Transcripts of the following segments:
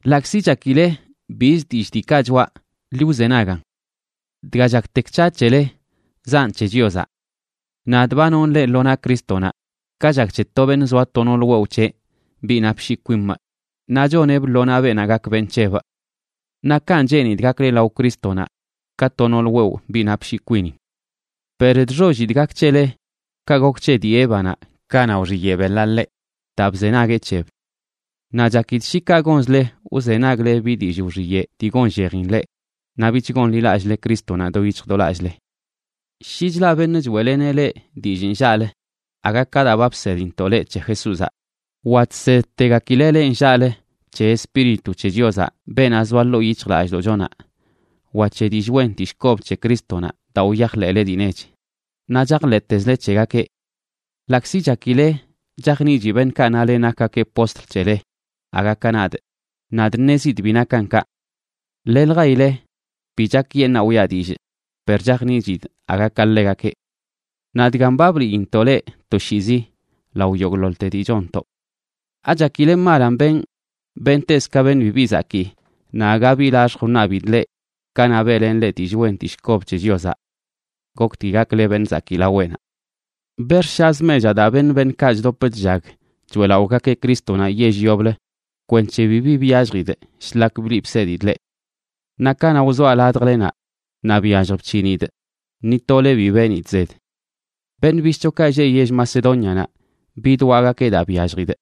Ḻaꞌkzi chakile biz dillꞌ diikaꞌ choꞌa, ḻi wzenagan. Dga chaktek c̱haꞌ c̱hele zaꞌn c̱he Chiozaꞌ. Nadꞌ ba nonꞌ leꞌ lo naꞌ Crístonaꞌ, ka chak c̱he to beṉꞌ zoa to nool wewꞌ c̱heꞌ, biꞌ napshii kwimꞌ, naꞌ choneꞌbꞌ lo naꞌ beenaꞌ gak beṉꞌ c̱hebꞌ. Naꞌ kanꞌ cheenidꞌ gakle lao Crístonaꞌ, ka to nool wewꞌ, biꞌ napshii kwinin. Per chxollidꞌ gak c̱hele ka gok c̱he dii Évanaꞌ kanaꞌ wxiyeꞌ beḻaꞌ ḻeꞌ daa bzenagueꞌ c̱heb. Naꞌ chakidꞌ shi kaꞌ gonzle wzenagle bi dillꞌ wxiyeꞌ dii gonllejin leꞌ, naꞌ bich gonḻilallꞌle Crístonaꞌ do yic̱hj do lallꞌle. Shi chlaꞌ beṉꞌ choeꞌleneꞌ leꞌ dillꞌ nllaꞌlə aga ka daa ba bsedintoꞌ leꞌ c̱he Jesúzaꞌ, wa chsedtegakileꞌ leꞌ nllaꞌlə c̱he Espíritu c̱he Chiozaꞌ, beenaꞌ zoa ḻoo yic̱hjlallꞌdoꞌchonaꞌ, wa c̱he dillꞌ wen dillꞌ kob c̱he Crístonaꞌ daa wyajḻeꞌle dii nech, naꞌ chajḻeꞌtezle c̱hegakeꞌ. Ḻaꞌkzi chakile chajniꞌchi beṉꞌkaꞌ nale nakgakeꞌ postl c̱hele aga ka nadꞌ, nadꞌ ṉezidꞌ bi nakan kaꞌ. Leljaile bi chakyeṉaa wiꞌa dillꞌ, per chajniꞌchidꞌ aga ka ḻegakeꞌ. Naꞌ dgan ba bliintoꞌ leꞌ toshiizi lao yogꞌḻoḻte dii chonntoꞌ. ¿Achakile malan benꞌ bentezꞌ ka beṉꞌ bibi zakii naꞌ aga bi laxjꞌ wṉabidꞌ leꞌ kanaꞌ beꞌlenꞌ leꞌ dillꞌ wen dillꞌ kob c̱he Chiozaꞌ? Goktgui gakle beṉꞌ zakii laweꞌnaꞌ. Bex̱ꞌshazꞌ mechaꞌ daa beṉ beṉꞌkaꞌ chdop chllag choeꞌlaꞌogakeꞌ Crístonaꞌ yell yoblə kwenc̱he bibi byalljidꞌ shlak bliꞌ bsedidꞌ leꞌ. Naꞌ kanaꞌ wzoaꞌ ladjlenaꞌ naꞌ byallj bc̱hinidꞌ, ni tole bi benidꞌ zed. Beṉꞌ bishꞌchokaꞌ lleꞌ yell Macedónianaꞌ bidwaꞌgakeꞌ daa byalljidꞌ.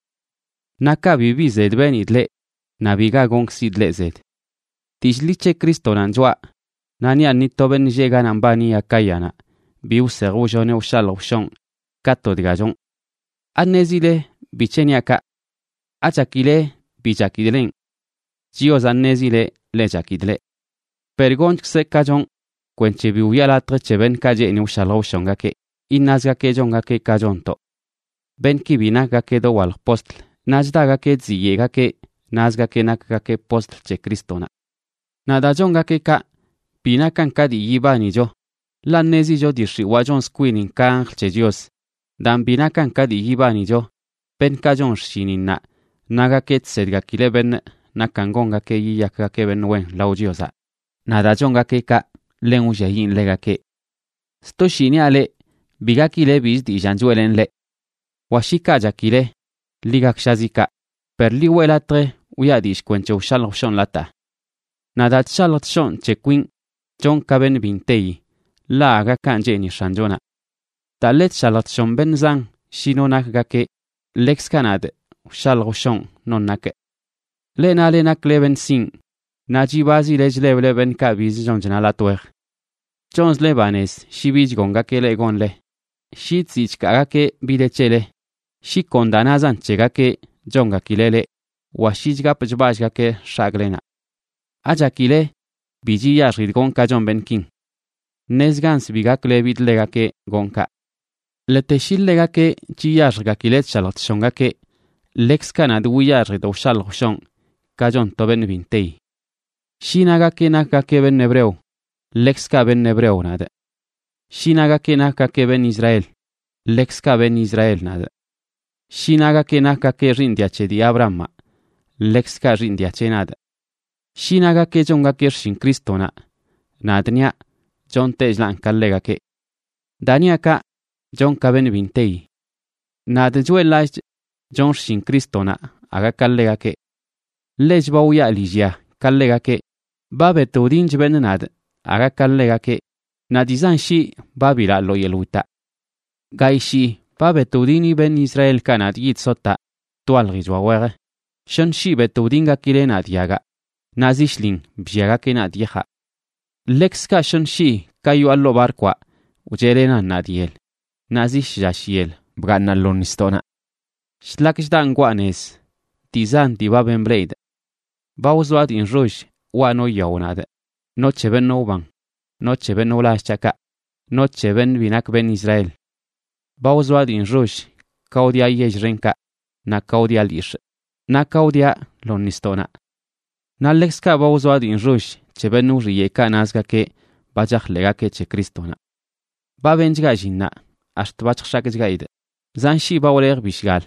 Naꞌ kaꞌ bibi zed benidꞌ leꞌ, naꞌ biga gonkzidꞌ leꞌ zed. Dillꞌ ḻi c̱he Crístonanꞌ choꞌa, naꞌ niaꞌ ni to beṉꞌ lleꞌ ganaꞌ mbani Acáyanaꞌ bi wsej wlloneꞌ wshalj wshonꞌ ka to dga chonꞌ. ¿Aṉezile bic̱he niaꞌ kaꞌ? ¿Achakile bi chakidꞌ lenꞌ? Chiozaꞌ ṉezileꞌ ḻe chakidꞌ leꞌ. Per gonchkzꞌ ka chonꞌ kwenc̱he bi wiꞌa latj c̱he beṉꞌkaꞌ cheeni wshalj wshongakeꞌ iṉazgakeꞌ chongakeꞌ ka chonntoꞌ. Beṉꞌki bi nakgakeꞌ dowalj postl, naꞌ chdagakeꞌ chziyeꞌgakeꞌ, nazgakeꞌ nakgakeꞌ postl c̱he Crístonaꞌ. Naꞌ daa chongakeꞌ kaꞌ bi nakan ka dii yibanicho, ḻaꞌ ṉezicho dii xiwaa chonz kwinin ka anjl c̱he Chios. Daan, bi nakan ka dii yibanicho beṉꞌkaꞌ chon xshininnaꞌ nagakeꞌ chsedgakileꞌ beṉꞌ nakan gongakeꞌ yiyakgakeꞌ beṉꞌ wen lao Chiozaꞌ. Naꞌ daa chongakeꞌ kaꞌ, ḻen wlliayiꞌn ḻegakeꞌ. Sto shii niaꞌ leꞌ, bi gakile bizə dillaan choeꞌlenꞌ leꞌ. Wa shi kaꞌ chakile, ḻi gakshazi kaꞌ, per ḻi weꞌ latj wiꞌa dillꞌ kwenc̱he wshalj wshonlataa. Naꞌ daa chshalj chshonꞌ c̱he kwinꞌ, chonꞌ ka beṉꞌ bi nteyi, ḻaꞌ aga kanꞌ cheeni X̱anchonaꞌ. Daa ḻe chshalj chshon beṉꞌ zan shi no nakgakeꞌ, ḻekzkaꞌ nadꞌ wshalj wshonꞌ non nakꞌ. Leꞌ nale nakle beṉꞌ sinꞌ naꞌ chibazile chleble beṉꞌkaꞌ bizə chon chna latꞌ wej. Chonzle banez shi bi chgongakeꞌ leꞌ gonle, shi chziꞌ chkaagakeꞌ bi de c̱hele, shi kon daa nazan c̱hegakeꞌ chongakileꞌ leꞌ, wa shi chgapꞌ chballꞌgakeꞌ x̱agꞌlenaꞌ. ¿Achakile bi chiyaxjidꞌ gonꞌ ka chon beṉꞌkin? Ṉezganz bi gaklebidꞌ ḻegakeꞌ gonꞌ kaꞌ. Ḻete shi ḻegakeꞌ chiyaxjgakileꞌ chshalj chshongakeꞌ, ḻekzkaꞌ nadꞌ wiyaxjidꞌ wshalj wshonꞌ, ka chon to beṉ bi nteyi. Shi nagakeꞌ nakgakeꞌ beṉꞌ hebreo, ḻekzkaꞌ beṉꞌ hebreo nadꞌ. Shi nagakeꞌ nakgakeꞌ beṉꞌ Israel, ḻekzkaꞌ beṉꞌ Israel nadꞌ. Shi nagakeꞌ nakgakeꞌ xiiṉ dia c̱he dii Abrahamaꞌ, ḻekzkaꞌ xiiṉ dia c̱heꞌ nadꞌ. Shi nagakeꞌ chongakeꞌ xshin Crístonaꞌ, nadꞌ niaꞌ chontechlaꞌn ka ḻegakeꞌ. (Daa niaꞌ kaꞌ chonꞌ ka beṉꞌ bi nteyi.) Nadꞌ choeꞌḻ-lallꞌchꞌ chonꞌ xshin Crístonaꞌ aga ka ḻegakeꞌ. Ḻech ba wyaa lillya ka ḻegakeꞌ, ba bet wdinch beṉꞌ nadꞌ aga ka ḻegakeꞌ, naꞌ dii zan shii ba bilaꞌ lo yeḻꞌ witaꞌ. Gayꞌ shii ba bet wdini beṉꞌ Israelkaꞌ nadꞌ yid sotaꞌ twaljichoa wej, shoṉ shii bet wdingakileꞌ nadꞌ yagaꞌ, naꞌ zi shlin blliagakeꞌ nadꞌ yajaꞌ. Ḻekzkaꞌ shoṉə shii ka yoꞌa ḻoo barkwaꞌ wcheꞌlenan nadꞌ yel, naꞌ zi shlla shyel bgaaṉaꞌ lo nisdoꞌnaꞌ. Shlak chdaꞌ ngwaa nez dii zan dii ba ben bleꞌidꞌ. Ba wzoaꞌ dii nxoll waꞌ no yao nadꞌ, no c̱he beṉꞌ wban, no c̱he beṉꞌ wlall c̱haꞌkaꞌ, no c̱he beṉꞌ bi nak beṉꞌ Israel. Ba wzoaꞌ dii nxoll ka wdiaꞌ yell xenkaꞌ, naꞌ ka wdiaꞌ lyix̱ꞌ, naꞌ ka wdiaꞌ lo nisdoꞌnaꞌ. Naꞌ ḻekzkaꞌ ba wzoaꞌ dii nxoll c̱he beṉꞌ wxiyeꞌkaꞌ nazgakeꞌ ba chajḻeꞌgakeꞌ c̱he Crístonaꞌ. Ba benchgaꞌ llinnaꞌ ax̱t ba chjx̱akchgaidꞌ, zan shii ba wlejꞌ bishgal,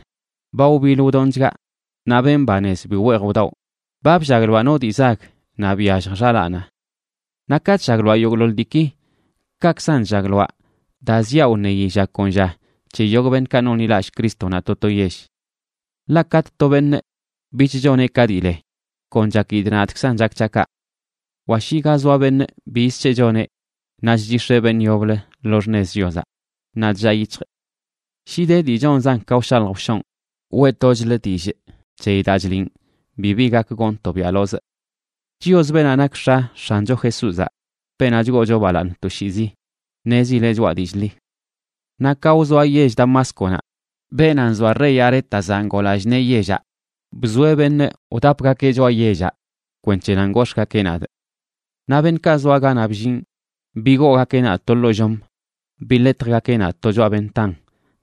ba wbiḻ wdonchgaꞌ naꞌ ben banez bi weej wdawꞌ, ba bllagloaꞌ no dii zag naꞌ byallj xalaanaꞌ. Naꞌ ka chllagloaꞌ yogꞌḻoḻ diiki, kaꞌkzan chllagloaꞌ daa ziaꞌ wṉeyi lla kon lla c̱he yogꞌ beṉꞌkaꞌ nonḻilallꞌ Crístonaꞌ to to yell. Ḻaꞌ katꞌ to beṉꞌ bich choneꞌ ka dii le, kon chakidꞌ nadꞌkzan chak c̱haꞌ kaꞌ; wa shi ga zoa beṉꞌ biz c̱heꞌ choneꞌ naꞌ chchix̱eꞌ beṉꞌ yoblə lo xṉez Chiozaꞌ, naꞌ chllaa yic̱hjꞌ. Shi de dii chonzan ka wshalj wshonꞌ, weꞌtochlꞌ dillꞌ c̱heyi daa chliꞌn bibi gak gonꞌ tobiaꞌlozꞌ. Chios, beenaꞌ nak X̱a X̱ancho Jesúzaꞌ, beenaꞌ chgoocho balaaṉ toshiizi, ṉezileꞌ choꞌa dillꞌ ḻi. Naꞌ ka wzoaꞌ yell Damásconaꞌ, beenaꞌ nzoa rey Arétazaꞌ ngoo lallꞌ nee yellaꞌ bzoeꞌ beṉꞌ wdapgakeꞌ choꞌa yellaꞌ kwenc̱he nan gox̱ꞌgakeꞌ nadꞌ. Naꞌ beṉꞌkaꞌ zoa ganaꞌ bllinꞌ, bigoogakeꞌ nadꞌ to ḻoo llom, biḻetjgakeꞌ nadꞌ to choꞌa ventan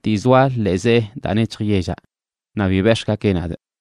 dii zoa ḻee zee daa nec̱hj yellaꞌ, naꞌ bi bex̱ꞌgakeꞌ nadꞌ.